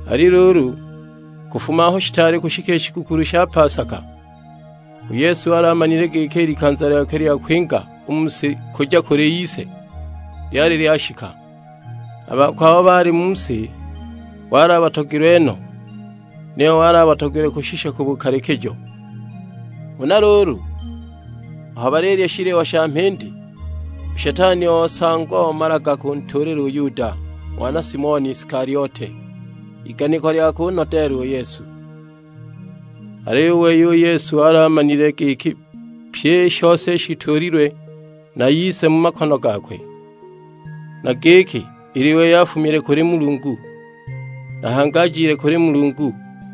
Ali luulu, kufuma aho shitaali kushika i shigukulu sha pasaka, u Yesu wali amanile giki i likanza lyakwe lya kwinga u mu si kuja kuli Ise, lyali lyashika. A bakwe abo bali mu si wali abatogilwe no, niyo wali abatogilwe kushisha ku bukalikijo! Huna luulu, aho balilya shiliwa sha mhindi, u Shetani osangwa omalaga kuntuulila u Yuda ng'wana Simoni Isikaliote, iganiko lya kunodeela u Yesu. Aliyo u wei u Yesu wali amanile giki, pyi i shose shituulilwe na Ise mu makono gakwe, na giki u wei afumile kuli Mulungu, na hangi ajile kuli Mulungu.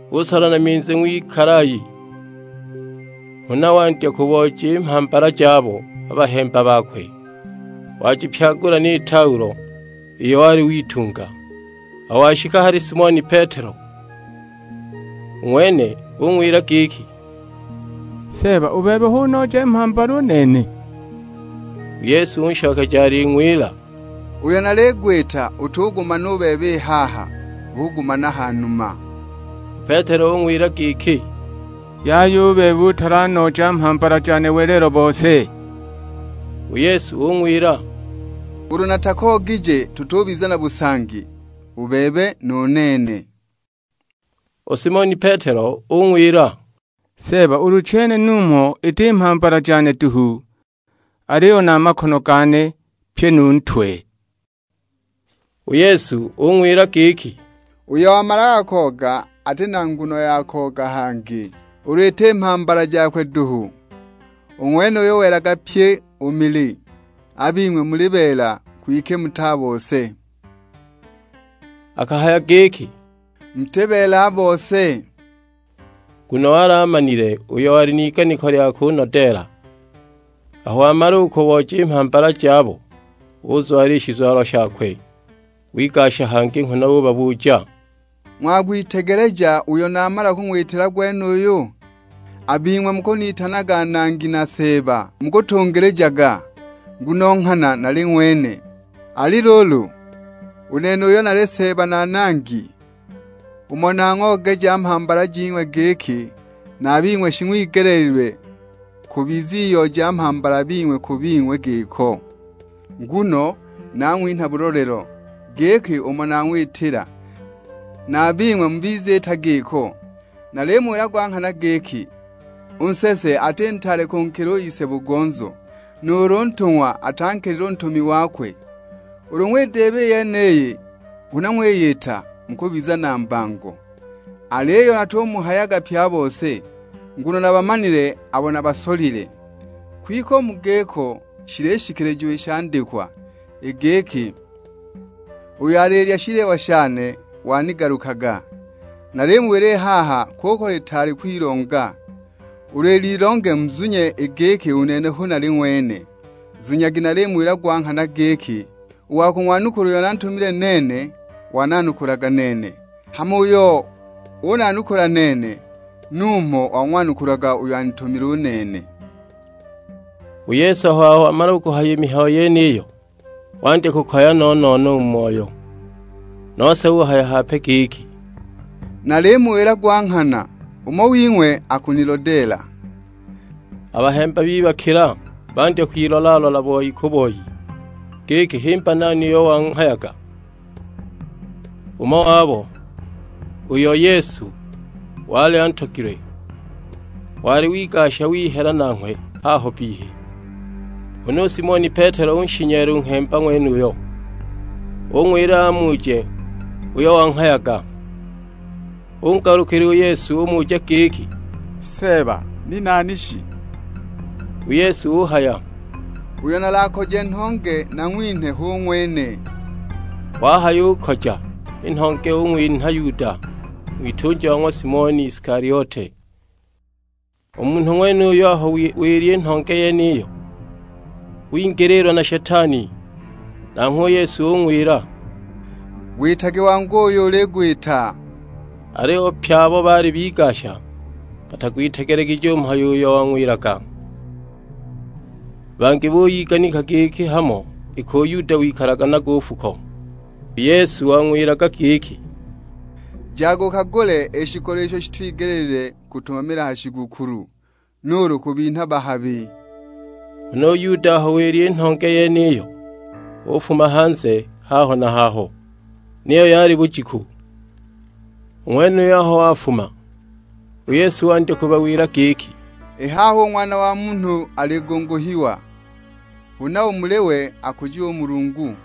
Usola na minzi ng'wikalayi, huna wandya kubooja i mhambala jabo a bahemba bakwe, wajipyagula ni taulo iyo wali witunga. Aho washika hali Simoni Petelo, u ng'wene ung'wila giki, "Seeba u bebe hu unooje mhambala u nene?" U Yesu unshokeja aling'wila, "Uyo naligwita utugumana u bebe i haha: ukugumana ha numa." U Petelo ung'wila giki, "Yaya u bebe utalanooja mhambala jane welelo bose!" U Yesu ung'wila, "Ulu natakoogije tutubiza na busangi, u bebe nu nene." U Simoni Petelo ung'wila, "Seeba, ulu chene numho iti mhambala jane duhu, aliyo na a makono gane, pyi nu ntwe!" U Yesu ung'wila giki, "Uyo wamalaga kooga ati na nguno ya kooga hangi, ulu iti mhambala jakwe duhu. U ng'wenuyo welaga pyi u mili. A bing'we muli beela, kwike muti a bose!" Akahaya giki, "Muti beela a bose;" nguno wali aamanile uyo wali n'iganiko lya kunodeela. Aho wamala u kubooja i mhambala jabo uzwala i shizwalo shakwe, wigasha hangi. Huna ubabuja, "Ng'wagwitegeleja uyo namala kung'witila gwenuyu? A bing'we mukunitanaga Nangi na Seeba, mukutungilijaga, nguno nghana nali ng'wene. Ali luulu, u nene uyo nali Seeba na Nangi, umo nang'oogeja mhambala jing'we giki, na a bing'we shing'wigeleelilwe kubiziyooja mhambala bing'we ku bing'we giko. Nguno nang'winha bulolelo, giki umo nang'witila, na a bing'we mubiziita giko. Nalimuwila gwa nghana giki, u nsese ati ntaale kunkila u ise-bugonzo; nuulu u ntung'wa atankilile u ntumi wakwe. Ulu ng'wideeba i yeniyi huna ng'wiyita, mukubiza na mbango. Aliyo natumuhayaga pye a bose, nguno nabamanile abo nabasolile; kwike u mu giko shilishikilijiwa i shandikwa: i giki, 'Uyo alilya shiliwa shane waniigalukaga!' Nalimuwila i haha kuko itaali kwilonga, ulu ililonge muzunye i giki u nene hu nali Ng'wene. Zunyagi nalimuwila gwa nghana giki, u wa kung'wanukula uyo nantumile nene, wananukulaga nene, hama uyo unanukula nene, numho wang'wanukulaga uyo anitumile u nene." U Yesu aho wamala kuhaya i mihayo yeniyo, wandya kukoya no-no-no u mu moyo; nose uhaya hape giki, "Nalimuwila gwa nghana, umo wing'we akunilodeela!" A bahemba bibakila, bandya kwilola-lola boi ku boi, giki himba nani uyo wanghayaga. Umo wabo, uyo Yesu wali antogilwe, wali wigasha wihela nanghwe haho bbihi. Huna u Simoni Petelo unshinyela u nghemba ng'wenuyo, ung'wila amuje uyo wanghayaga. Ungalukila u Yesu; umuja giki, "Seeba, ni nani shi?" U Yesu uhaya, "Uyo nalakoje nhonge nang'winhe hu ng'wene." Wahayukoja nhonge ung'winha Yuda ng'witunja wa ng'wa Simoni Isikaliote! U munhu ng'wenuyo aho wilya i nhonge yeniyo, wingiliilwa na Shetani; nanghwe u Yesu ung'wila, "Gwitage wangu uyo uligwita!" Aliyo pye abo baali bigasha batagwitegelegije u mhayo uyo wang'wilaga. Bangi buyiganika giki hamo iki u Yuda wikalaga nago u nfuko, u Yesu wang'wilaga giki, "Jaga ukagule i shikolo isho shitwigeleelilwe kutumamila ha shigukulu, nuulu kubinha bahabi." Huna u Yuda aho wilya i nhonge yeniyo ufuma hanze haho na haho; niyo yali bujiku! U ng'wenuyo aho wafuma, u Yesu wandya kubawila giki, "I haha u Ng'wana wa Munhu aligunguhiwa, huna u muli we akujiwe u Mulungu.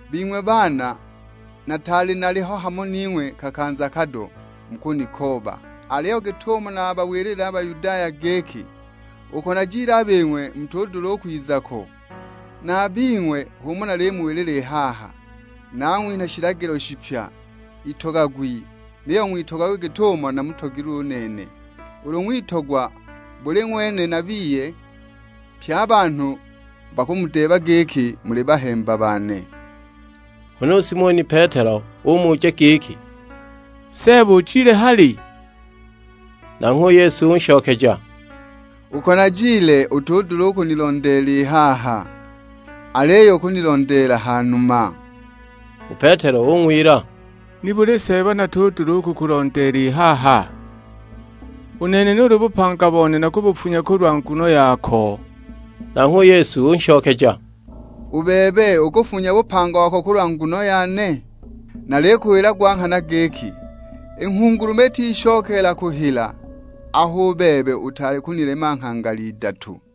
Bing'we baana, nataali naliho hamo ning'we kakanza kado, mukunikooba. Aliyo git'umo naabawililile Bayudaya giki, 'Uko najile a bing'we mutudula u kwiza ko,' na a bing'we h'umo nalimuwilila i haha! Nang'winha shilagilo shipya: Itogagwi, niyo ng'witogwe git'umo namutogelilwe u nene. Ulu ng'witogwa buli ng'wene na biye, pye a banhu bakumudeeba giki muli bahemba bane." Huna u Simoni Petelo umuja giki, "Seeba ujile hali?" Nanghwe u Yesu unshokeja, "Uko najile utudula u kunilondeela i haha, aliyo ukunilondeela ha numa!" U Petelo ung'wila, "Nibuli Seeba natudula u kukulondeela i haha? U nene nuulu bupanga bone nakubufunya kulwa nguno yako!" Nanghwe u Yesu unshokeja, "U bebe ukufunya bupanga wako kulwa nguno yane? Nalikuwila gwa nghana giki, i nghungulume itishokeela kuhila, aho u bebe utaali kunilema nghangala idatu!"